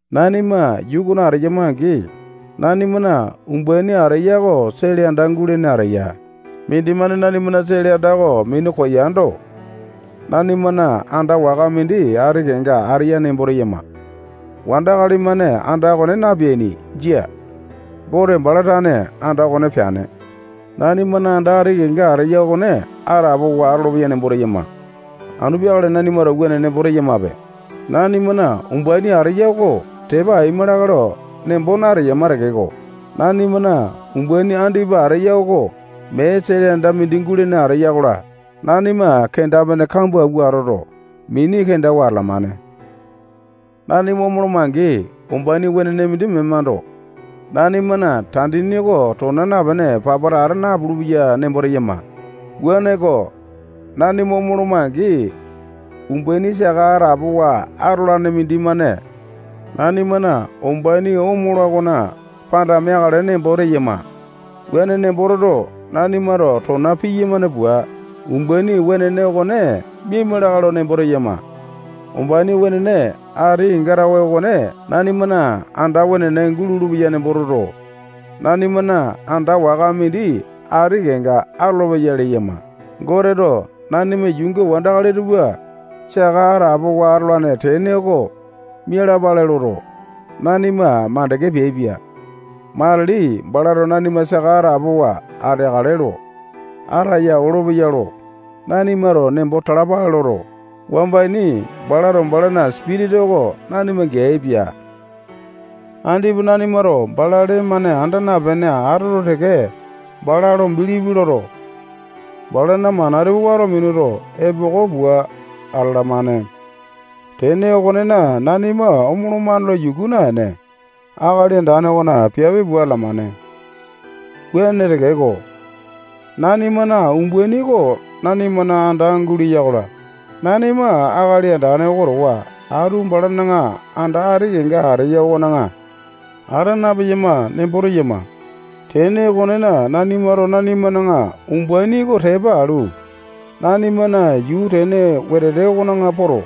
Nanima yuu okona ateyama-angi, nanimana umbaini ateya oko sele anda gulene ateya. Mindimane nanimana sele anda okone minu koyando, nanimana anda waka mindi ati kenga ateya nembo teyama. Wandakali-mane anda okone napeaini. Jia. Gote bala tane anda okone peane. Nanimana anda ati kenga ateya okone atapowa atolopeya nembo teyama. Anu peakale nanimato wuane nembo teyamape. Nanimana umbaini ateya oko tepa aima lakae lo nembo nateyama tekeko, nanimana umbaini andipa ateya oko mee sele anda mindi gulene ateya-kola, nanima kenda-pene kambua awua atoto, mini kendawa atalamane. Nanima omoloma-angi, umbaini wenene mindi memando, nanimana tandini oko tona napene, papata ata napulu-peya nembo teyama. Wuaneko, nanima omoloma-angi, umbaini saka atapowa atolane mindimane nanimana umbaini omola okona panda meakale nembo teyama. Wuane nembo toto, nanimato tona piyamane pua, umbaini wenene okone miaima lakae lo nembo teyama. Umbaini wenene ati kenga tawe okone nanimana anda wenene gulolo-peya nembo toto, nanimana anda waka mindi ati kenga atolopeya leyama. Goteto nanima yuunga wandakali tupa saka atapowa atolane tene oko mialapale loto, nanima makande peaipia. Matili balato nanima saka atapowa ateakale lo ataya olopeya lo nanimato nembo talapale loto, wamba ini balato balana Sipitisa oko nanima geaipia. Andipa nanimato bala lee-mane anda napene atoto teke, bala lo bilipi loto, balana mana tupa wato minuto, epoko pua atalamane. Tene okonena, nanima omolomane lo yuku naene, Akali Andane okona piape pua atalamane. Wuane tekeko, nanimana umbaini oko nanimana anda guleya-kola, nanima Akali Andane oko towa atu balana anda ati kenga ateya okona ata napeyama nembo teyama. Tene okonena, nanimato nanimana umbaini oko tepa alu, nanimana yuu tene wetete okona poto,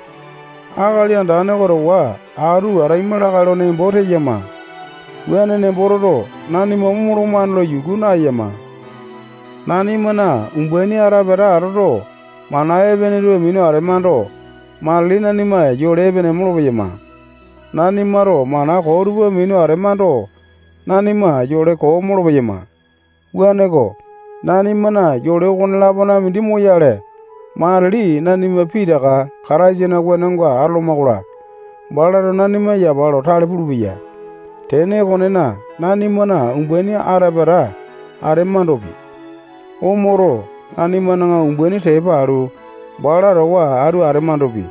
Akali Andane oko towa atu ataima lakae lo nembo teyama. Wuane nembo toto, nanima omolomane lo yuku naeyama. Nanimana umbaini ata pata atoto, mana epene tupa minu atemando, matili nanima yole epene molopeyama. Nanimato mana koo tupa minu atemando, nanima yole koo molopeyama. Wuaneko, nanimana yole okone-lapona mindi moyale, matili nanima pitaka Kataisana wenonga atoloma-kola, balato nanima yapa lo tale pulupeya. Tene okonena, nanimana umbaini ata pata atemandopi, omoto, nanimana umbaini tepa alu, bala towa atu atemandopi,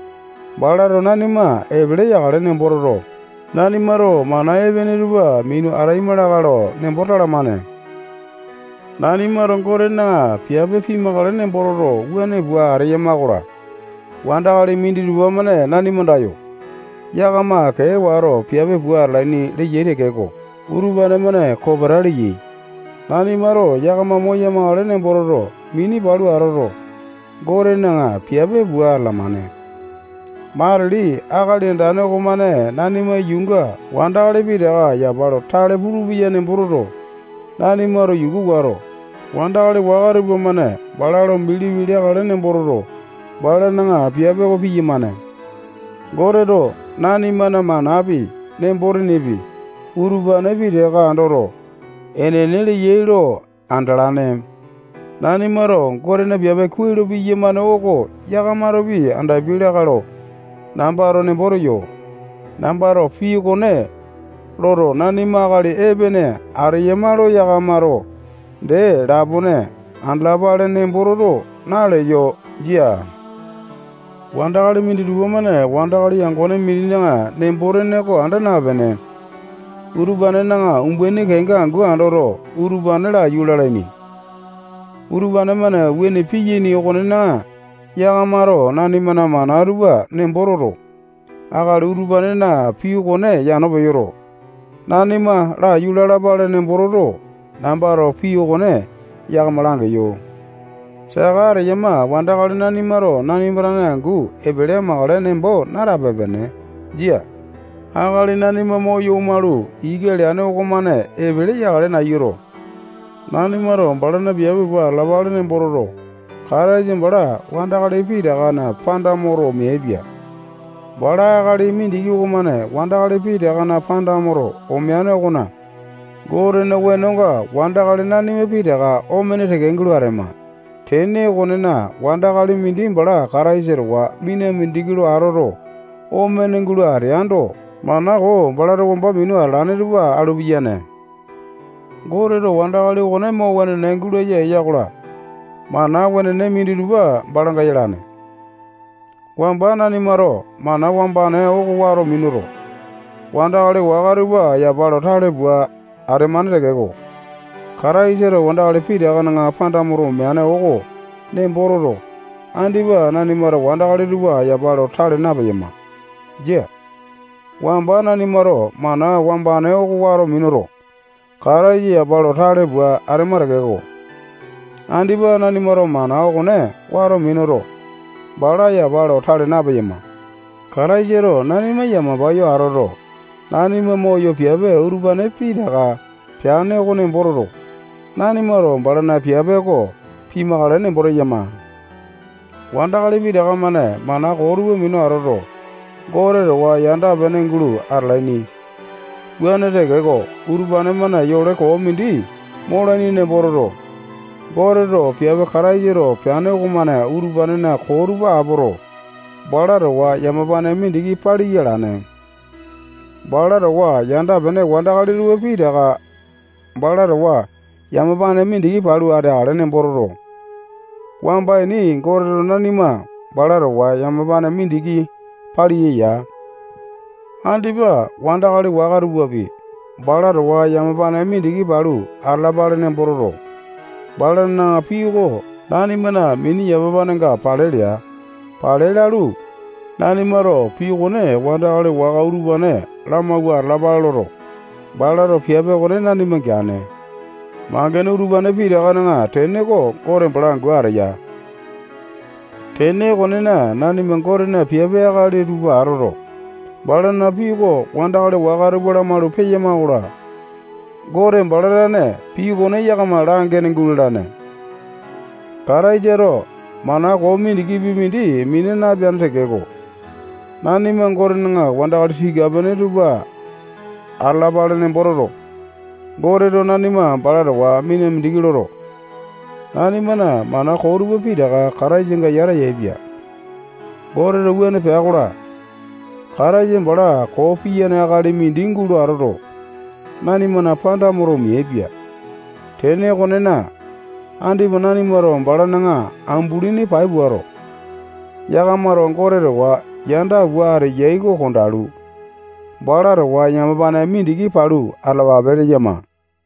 balato nanima epele yakale nembo toto, nanimato mana epene tupa minu ataima lakae lo nembo talamane. Nanimato Gotena piape pimakale nembo toto, wuane pua ateyama-kola, wandakali minditupa-mane nanima andayo, yakama kee wato, piape pua atalaini leyai tekeko, utupane-mane kopeta leyai. Nanimato yakama moya-makale nembo toto, mini palu atoto, Gotena piape pua atalamane. Matili Akali Andane okomane nanima yuunga wandakali pitaka yapa lo tale pulupeya nembo toto, nanimato yuku wato, wandakali waka tupamane bala lo bilipi leakale nembo toto, balana piape oko piyamane. Goteto nanimana manapi, nembo-tenepi, utupane pitaka andoto, enene leyai lo andalane. Nanimato Gotena piape kuai lo piyamane oko yakamatopi andapiai lakae lo nambato nembo teyo. Nambato pii okone loto, nanima akali epene ateyama lo yakamato dee lapone andalapale nembo toto, naleyo. Jia. Wandakali minditupa-mane wandakali yangone mindina nembo-tene oko anda napene, utupanena umbaini kenga angu andoto, utupane laiyu lalaini. Utupane-mane wuane piyaini okonena, yakamato nanimana mana tupa nembo toto, akali utupanena pii okone yano peyoto, nanima laiyu lalapale nembo toto, nambato pii okone yakama langeyo. Saka ateyama wandakali nanimato nanima tane angu epele amakale nembo natape-pene. Jia. Akali nanima moyo omalu, ika leane okomane epele yakale nayuto, nanimato balana piape pua atalapale nembo toto, Kataisa bala wandakali pitakana panda moto omeaipia. Bala akali mindiki okomane wandakali pitakana panda moto omeane okona, Gotena wenonga wandakali nanima pitaka omene teke gulo atema. Tene okonena, wandakali mindi bala Kataisa towa mina mindiki lo atoto, omene gulo ateando, mana koo balato wamba minu atalane tupa alu piyane. Goteto wandakali okone mo wenene gulaya eya-kola, mana wenene minditupa balanga yalane. Wamba nanimato mana wambane oko wato minuto, wandakali waka tupa yapa lo tale pua atemane tekeko, Kataisato wandakali pitakana panda moto omeane oko nembo toto, andipa nanimato wandakali tupa yapa lo tale napeyama. Jia. Wamba nanimato mana wambane oko wato minuto, Kataisa yapa lo tale pua atema tekeko, andipa nanimato mana okone wato minuto, bala yapa lo tale napeyama. Kataisato nanima yamapa yo atoto, nanima moyo piape utupane pitaka peane oko nembo toto, nanimato balana piape oko pimakale nembo teyama. Wandakali pitaka-mane mana koo tupa minu atoto, Gote towa yanda-pene gulo atalaini. Wuane tekeko, utupane-mane yole koo mindi molaini nembo toto, Goteto piape Kataisato peane okomane utupanena koo tupa apoto, bala towa yamapane mindiki paliya alane. Bala towa yanda-pene wandakali tupa pitaka bala towa yamapane mindiki palu ateakale nembo toto, wamba ini Goteto nanima bala towa yamapane mindiki paliya ya. Andipa wandakali waka tupapi bala towa yamapane mindiki palu atalapale nembo toto, balana pii oko nanimana mini yamapanenga pale lea. Pale lalu, nanimato pii okone wandakali waka utupane lamawua atalapale loto, balato piape okone nanima geane. Mangene utupane pitakana tene oko Gote bala angu ateya. Tene okonena, nanima Gotena piape akali tupa atoto, balana pii oko wandakali waka tupa lamalu peyama-kola, Gote bala tane pii okone yakama langene gulalane. Kataisato mana koo mindikipi mindi mina napeane tekeko, nanima Gotena wandakali tika-pene tupa atalapale nembo toto, Goteto nanima bala towa mina mindiki loto, nanimana mana koo tupa pitaka Kataisanga yata yaepia. Goteto wuane pea-kola, Kataisa bala koo piyane akali mindi gulo atoto, nanimana panda moto, omeaipia. Tene okonena, andipa nanimato balana ambulini pai puato, yakamato Gote towa yanda pua ateyai oko kondalu, bala towa yamapane mindiki palu atalapape leyama.